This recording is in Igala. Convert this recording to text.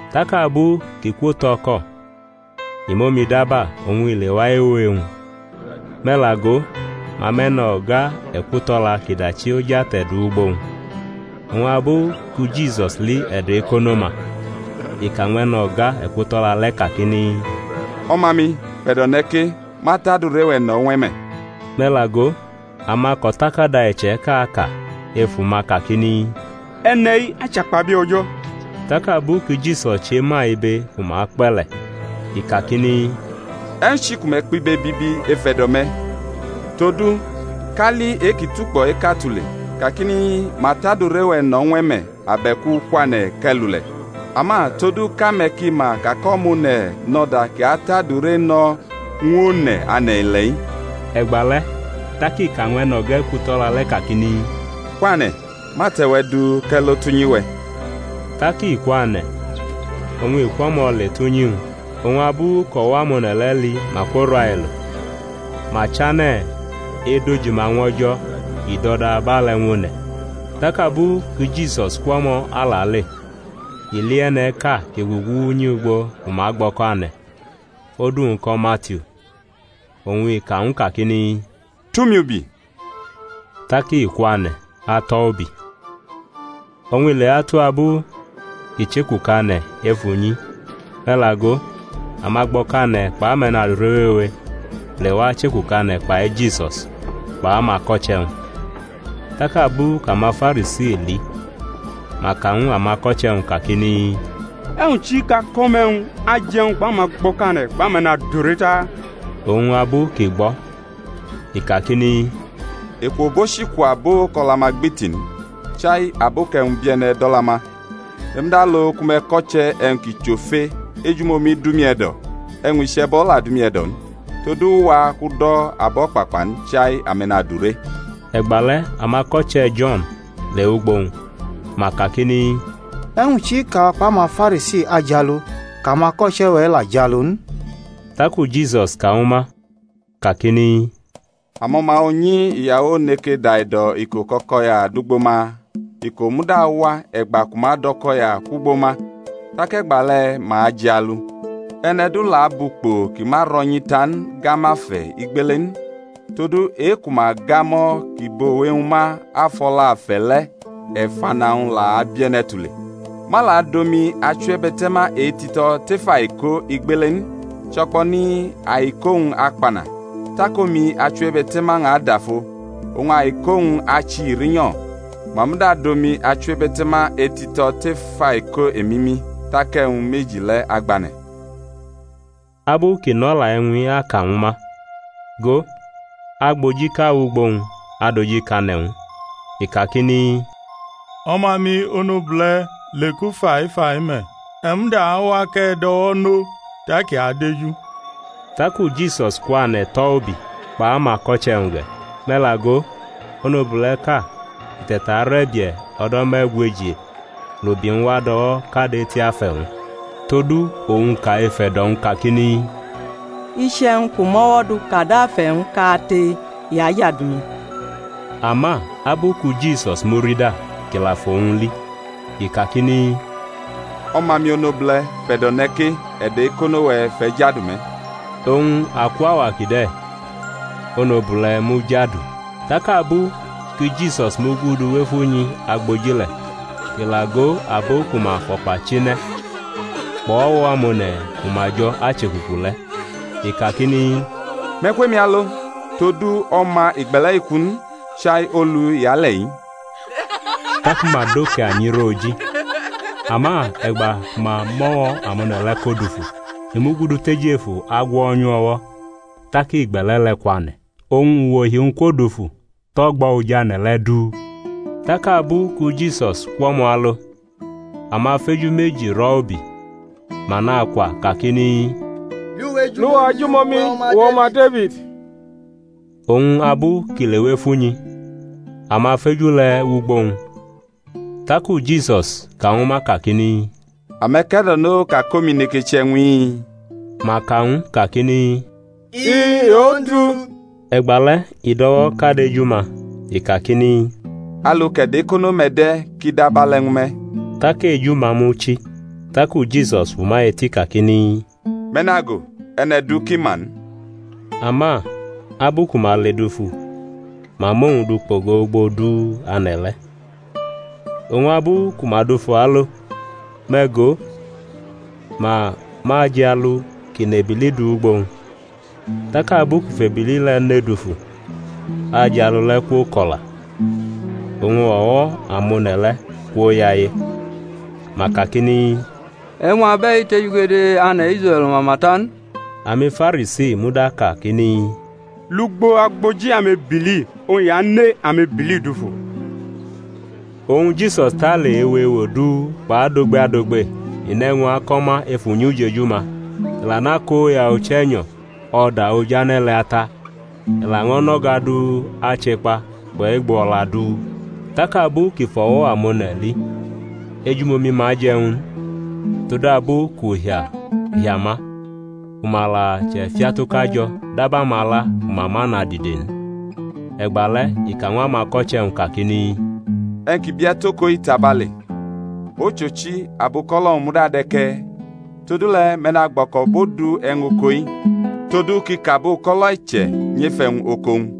Tak abu kʼi kwotʼo̩ko̩, i mʼomi daba oñ i lewa ewo e-wñ. Me̩ la go, ma mʼe̩no̩ga ekuto̩la kʼi dachi oj ate̩ du wʼugbo-wñ; oñ abu ku Jisus li e̩do̩ ekono-ma, i ka ñw e̩no̩ga ekuto̩la le̩ kakini, O̩ma-mi, fʼe̩do̩ ne̩ ke; ma tʼadure-we̩ no̩ ñw e̩ me̩. Me̩ la go, amako̩takada iche̩ka ka ef uma kakini, E̩ne̩-i achakpabie̩ O̩jo̩. Tak abu ki Jisus chema ibe ku ma kpe̩ le̩, i kakini, E̩wñ chi ku me̩ kpʼibe bibi efe̩do̩-me̩? Todu, kali e-kʼi tukpo̩ eka tule, kakini, Ma tʼadure-we̩ no̩ ñw e̩ me̩, abe̩ku, Kwane̩ kʼe̩ lule̩? Ama todu kʼame̩ ki ma ka kʼO̩ma One̩ nʼo̩da kʼi atʼadure no ñw one̩ ane̩-ile̩-i, e̩gbale̩ tak i ka ñw e̩no̩ga ekuto̩la le̩ kakini, Kwane̩, mʼate̩-we̩ du kʼe̩ lo tʼunyi-we̩. Tak i kwane̩, oñ i kwʼo̩mo̩ le tʼunyi-wñ. Oñ abu kʼo̩wo̩ amone̩ le̩ li ma kworailo, ma chane̩ edojima ñw O̩jo̩ kʼi dʼo̩da abe̩le̩ ñw one̩. Tak abu ki Jisus kwʼo̩mo̩ alale, i li e̩ne̩ʼka kʼi gugu unyi ugbo ku ma gbʼo̩kane̩, odu-wñ ko̩ Matiu. Oñ i ka ñw u kakini, Tʼumi ubi. Tak i kwane̩ atʼo̩ ubi. Oñ i lewatu abu kʼi chekukane̩ ef unyi, me̩ la go, amagbo̩kane̩ kpʼame̩nadure wewe lewa chekukane̩ kpai Jisus kpʼamako̩che̩-wñ. Tak abu kʼamaFarisi li, ma ka ñw amako̩che̩-wñ kakini, E̩wñ chi kʼako̩ me̩ e̩wñ aje̩-wñ kpʼamagbo̩kane̩ kpʼame̩nadure ta? Oñ abu kʼi gbʼo̩, i kakini, Eku obochi ku abo kʼo̩la-ma gbiti n, chai abo kʼe̩wñ bie̩ne̩ dʼo̩la-ma Me̩ muda lo ku me̩ ko̩che̩ e̩wñ kʼi chʼofe, Ejumomi dʼumi e̩do̩, e̩wñ iche̩bo̩ la dʼumi e̩do̩ n; todu u wa kʼu do̩ abo̩kpakpa n, chai ame̩nadure. E̩gbale̩ amako̩che̩ Jo̩n lewʼugbo-wñ, ma kakini, E̩wñ chi kʼawa kpʼamaFarisi ajialu, kʼamako̩che̩-we̩ la ajialu n? Taku Jisus ka ñwu ma kakini, Amo̩ma unyi iyawo neke daido̩ iko kʼo̩ko̩ya dʼugbo ma? Iko̩-wñ muda awa, e̩gba ku ma adʼo̩ko̩ya kwʼugbo ma, tak e̩gbale̩ ma ajialu. E̩ne̩ du la abʼukpo kʼi ma ro̩nyi ta n gamʼafe̩ igbele n; todu e-ku ma gamʼo̩ kʼi bʼowe-wñ ma afʼo̩la afe̩ le̩, e̩fana-wñ la abie̩ne̩ tule. Ma la dʼomi achiwebe̩te̩ma etito̩ tef aiko igbele n, cho̩kpo̩ni aiko-wñ akpana; tak omi achiwebe̩te̩ma-wñ adafo, oñ aiko-wñ achihi rinyo̩. Ma muda adʼomi achiwebe̩te̩ma etito̩ tef aiko emimi, tak e̩wñ meji le̩ agbane̩. Abu kʼi nʼo̩la e̩wñ-i aka ñwu ma, go, agbojiʼka wʼugbo-wñ adojikane̩ ñw u, i kakini, O̩ma-mi onobule̩ leku faifai me̩: e̩ muda awa kʼe̩ dʼo̩wo̩ nʼo tak i adeju. Taku Jisus kwane̩ tʼo̩ ubi, kpʼamako̩che̩-wñ ge̩. Me̩ la go, onobule̩ʼka kʼi te̩tarʼe̩bie̩ o̩do̩ me̩gweji, lʼubi-wñ wa dʼo̩wo̩ kad eti afe̩-wñ. Todu owñ ka ef e̩do̩-wñ kakini, Iche̩wñ kʼu mʼo̩wo̩ du kad afe̩-wñ kate, i ajadu mi. Ama abu ku Jisus murida, kʼi la fʼowñ li, i kakini, O̩ma-mi onobule̩, fʼe̩do̩ ne̩ ke; e̩do̩ e̩kono̩-we̩ fʼe̩ jadu me̩. Oñ akwʼauwa kide̩ onobule̩ mujadu. Tak abu ki Jisus mugudu wʼef unyi agboji le̩ kʼi la go abo ku ma fʼo̩kpachine̩ kpʼo̩wo̩ amone̩ ku ma jo̩ achekuku le̩, i kakini, Me̩ kwʼemi alo: todu o̩ma igbe̩le̩-i ku n, chai olu i ale̩-i. Taku ma dʼoke anyi rʼo oji. Ama e̩gba ku ma mʼo̩wo̩ amone̩ le̩ ko dufu, i mugudu tʼejefu agwo̩nyʼu o̩wo̩, tak igbe̩le̩ le̩ kwane̩. Oñ uwohi-wñ kwodufu tʼo̩gbo̩ oj ane̩ le̩ du. Tak abu ku Jisus kwʼo̩mo̩ alo, amafeju meji rʼo̩ ubi, ma nakwa kakini, Lʼuwa ejumomi, uwe̩, O̩ma Defid! Oñ abu kʼi lewʼef unyi, amafeju le̩ wʼugbo-wñ; taku Jisus ka ñwu ma kakini, Ame̩ ke̩do̩no ka kʼomi neke che e̩wñ-i? Ma ka ñw u kakini, I-i, Ondu. E̩gbale̩ i dʼo̩wo̩ kad eju-ma, i kakini, Alu kʼe̩do̩ ekono-me̩ de̩, kʼi dʼabe̩le̩ ñwu me̩. Tak eju-ma muchi; taku Jisus fʼuma eti kakini, Me̩ nago; e̩ne̩ du ki ma n. Ama abu ku ma ledufu ma mʼowñ du kpogo ugbo du ane̩ le̩. Oñ abu ku ma dufu alo, me̩ go, ma mʼajialu kʼi nʼebili du wʼugbo-wñ. Tak abu kʼi fʼebili le̩ ne dufu, ajialu le̩ kwoko̩la. Oñ o̩wo̩ amone̩ le̩ kwoyaye, ma kakini, E̩wñ abe̩i tejugede ane̩ Israe̩l mama ta n. AmiFarisi muda kakini, Lugbo agboji amebili oñ i ane amebili dufu. Oñ Jisus tale ewo ewo du kpʼadogbe adogbe; i nʼe̩wñ ako̩ ma ef unyi ujeju-ma, i la nʼakoya Uche̩nyo̩ o̩da ojane̩ le̩ ata, i laño̩ nʼo̩ga du ache kpa kpʼe̩gbo o̩la du. Tak abu kʼi fʼo̩wo̩ amone̩ li ejumomi-ma je̩ ñw u n, todabu kʼuhia ahia ma, ku ma la chʼefiatuka jo̩ dab amala ku ma ma nʼadide n. E̩gbale̩ i ka ñw amako̩che̩-wñ kakini, E̩wñ ki bie̩ tʼoko-i tabale, ochochi, abuko̩lo̩-wñ muda de̩ ke̩e̩. Todule̩ me̩ nagbo̩ko̩bʼodu e̩wñ oko-i, todu kʼi kʼabuko̩lo̩ e̩che̩ nyʼef e̩wñ oko-wñ.